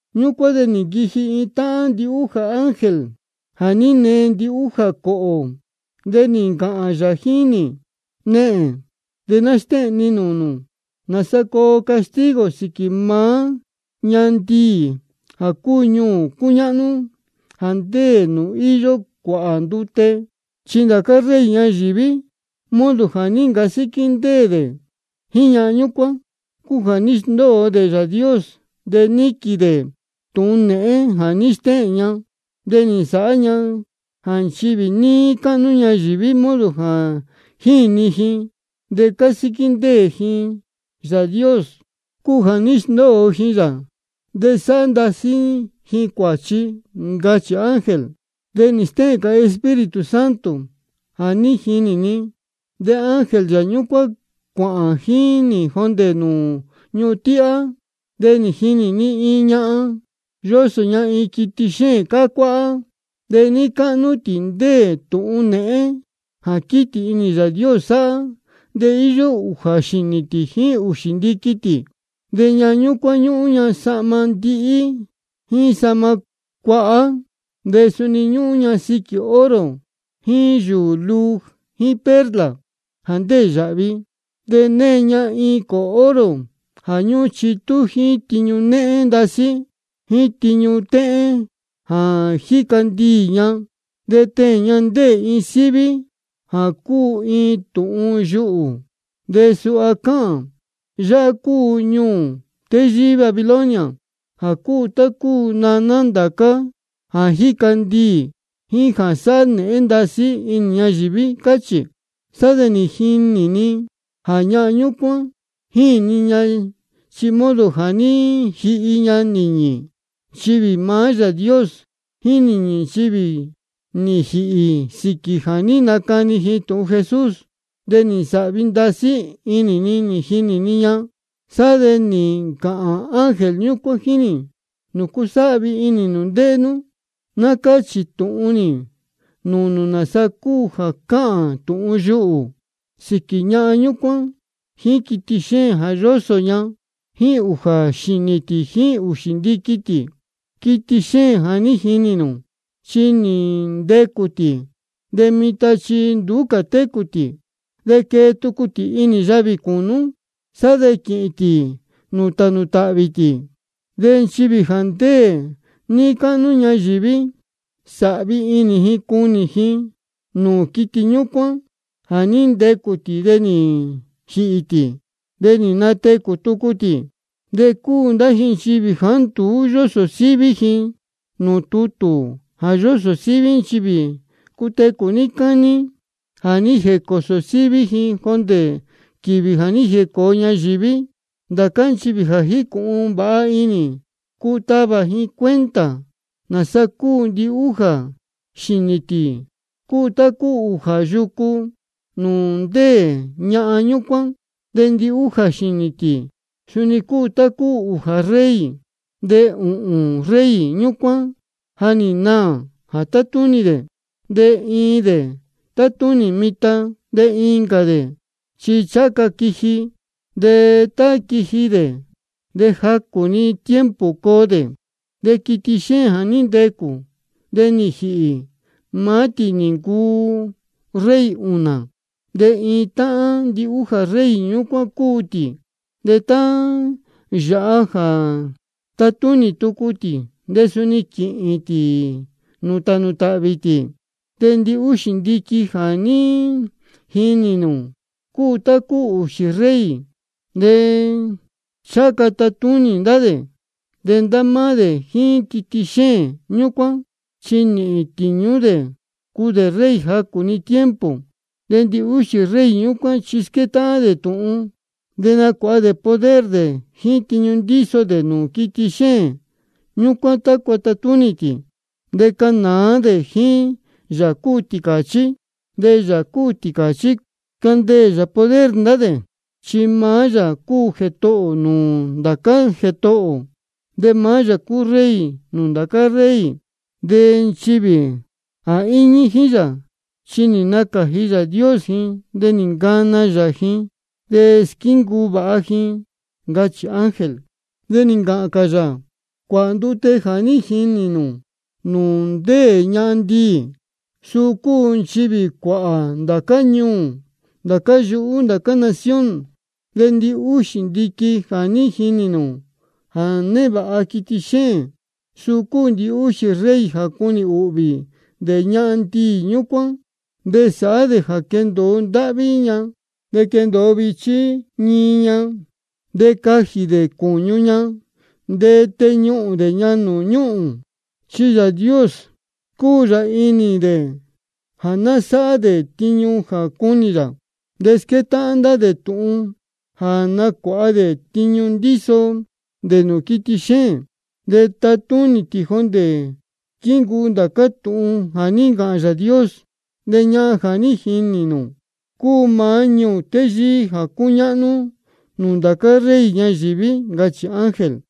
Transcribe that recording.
Ñúcuán de nī nquiji iin táhán ndihújā ángel jā ní nee ndihújā cōhō, de nī ncāhān yā jíín nī: Nehēn, de ná stéhēn ni nūū nū nāsa coo castigo sīquī maá ñahan ndiī jā cúu ñuū cúñáhnú jā ndéē nūū íyó cuāhā ndute. Chi ndācá rey ñayīví, modo jā ní ncasíquí ndéē dē jíín ñahan ñúcuán, cúu jā ní sndóo dē Yāā Dios de níquīn dē tūhun nēhén jā ní stéhēn ña. De nī nsāhá ña jā nchivī níí cáhnú ñayīví, modo jā jíni ji de cásíquí ndéē ji Yāā Dios cúu jā ní sndóo ji yā de sáhá ndasí ji cuāchi, ncachī ángel. De nī stéhēn cā Espíritu Santo jā ní jinī ni, de ángel yā ñúcuán cuāhān jíín nī jondē nūū ñuhun tíhá. De nī jinī ni iin ñahan, yósō ña iin quiti xéēn cácuáhá. De níí cáhnú tī ndéē tūhun nēhén jā quítī inī Yāā Dios sáhá. De íyó ūjā xīnī tī jíín ūxī ndiqui tī. De ñahan ñúcuán ñúhún ña sahma ndihí jíín sahma cuahá, de suni ñúhún ña siquī oro jíín yūū luu jíín perla jā ndéē yāhvi. De née ña iin cōhō oro jā ñúhún chitú jíín tiñu néhén ndasí jíín tiñu téhén jā jíca ndiī ña. De teēn ña ndéē iin síví jā cúu iin tūhun yuhū, de suha cáhān: Yáhá cúu ñuū téyíí Babilonia, jā cúu tá cúu naná ndācá jā jíca ndiī jíín jā sáhá nēhén ndasí inī ñayīví, cáchī. Sá de nī jinī ni jā ñahan ñúcuán jíni ña chi modo jā ní jihi ña nīñī nchivī maá Yāā Dios jíín nīñī nchivī nī jīhī sīquī jā ní nacani ji tūhun Jesús. De nī nsāhvi ndasí inī ni nī jinī ni ña. Sá de nī ncāhān ángel ñúcuán jíín nī: ¿Nūcu sáhvi inī nū ndéhé nú? Ná cáchī tūhun nī nūū nū nāsa cúu jā cáhān tūhun yuhū sīquī ñahan ñúcuán jíín quiti xéēn jā yósō ña, jā íyó ūjā xīnī tī jíín ūxī ndiqui tī. Quiti xéēn jā ní jinī nū, chi nī ntecū tī, de mitan chi nduú cā tī. De quee tucu tī inī yavī cūnú, sá de quīhīn tī nūū tānū tāhvī tī. De nchivī jā ndéē níí cáhnú ñayīví, sāhvi inī ji cunī ji nūū quiti ñúcuán jā ní ntecū tī de nī jīhī tī, de nī natecū tucu tī. De cúu ndá ji nchivī jāá nduú yósō síví ji nūū tutū jā yósō síví nchivī cutecū níí cání jā ní jēcōsō síví ji jondē quīvī nī jēcōo ñayīví. Ndācá nchivī jā jícūhun vāha inī, cuu tavā ji cuenta nāsa cúu: Ndihújā xīnī tī cúu tá cúu ūjā yucu nūū ndéē ñahan ñúcuán. De ndihújā xīnī tī suni cúu tá cúu ūjā rey. De ūhūn rey ñúcuán ja nī naā jā tátúnī dē, de iin dē tátúnī mitan, de incā dē chi ncháha ca quiji. De tá quiji dē de jacū-ni tiempo coo dē. De quiti xéēn jā ní ntecū, de nī jīhī, maá tī nī ncuu rey ūnā. De iin táhán ndihújā rey ñúcuán cúu tī. De tá yāha jā tatúnī tucu tī de suni quīhīn tī nūū tānū tāhvī tī. De ndihúxī ndiqui jā ní jinī nū cúu tá cúu ūxī rey, de ncháha ca tatúnī ndá dē. De ndá máá dē jíín quiti xéēn ñúcuán, chi nīhīn tīñú dē cuu dē rey jacū-ni tiempo. De ndihúxī rey ñúcuán chi squétáhán dē tūhun, de nacuāha dē poder dē jíín tiñu ndíso dē nūū quiti xéēn ñúcuán tácua tatúnī tī. De canāá dē jíín Yāā cúu Tīcāchí. De Yāā cúu Tīcāchí candeē yā poder ndá dē. Chi maá yā cúu Jētohō nūū ndācá jētohō, de maá yā cúu Rey nūū ndācá rey. De nchivī jā íñí jíín yā, chi nī nacāji Yāā Dios ji de nī ncana yā ji, de squíncuu vāha ndá ji, ncachī ángel. De nī ncāhān cā yā: Cuāhā ndute jā ní jinī nū nūū ndéē ñahan ndiī, suu cúu nchivī cuāhā ndācá ñuū, ndācá yuhú, ndācá nación. De ndihúxī ndiqui jā ní jinī nū jā névāha quiti xéēn, suu cúu ndihúxī rey jā cunī ūhvī dē ñahan ndiī ñúcuán. De sāhá dē jā quendōo ndáhví ña de quendōo vichí ñií ña. De cajī dē cūñu ña de teñuhūn dē ña nūū ñúhūn. Chi Yāā Dios scúu yā inī dē jā ná sáhá dē tiñu jā cúnī yā. De squétáhán ndá dē tūhun jā nacuāha dē tiñu ndíso dē nūū quiti xéēn, de tatúnī tī jondē squíncuu ndācá tūhun jā ní ncāhān Yāā Dios. De ñahan jā ní jinī nū cúu maá ñuū téyíí jā cúñáhnú nūū ndācá rey ñayīví, ncachī ángel.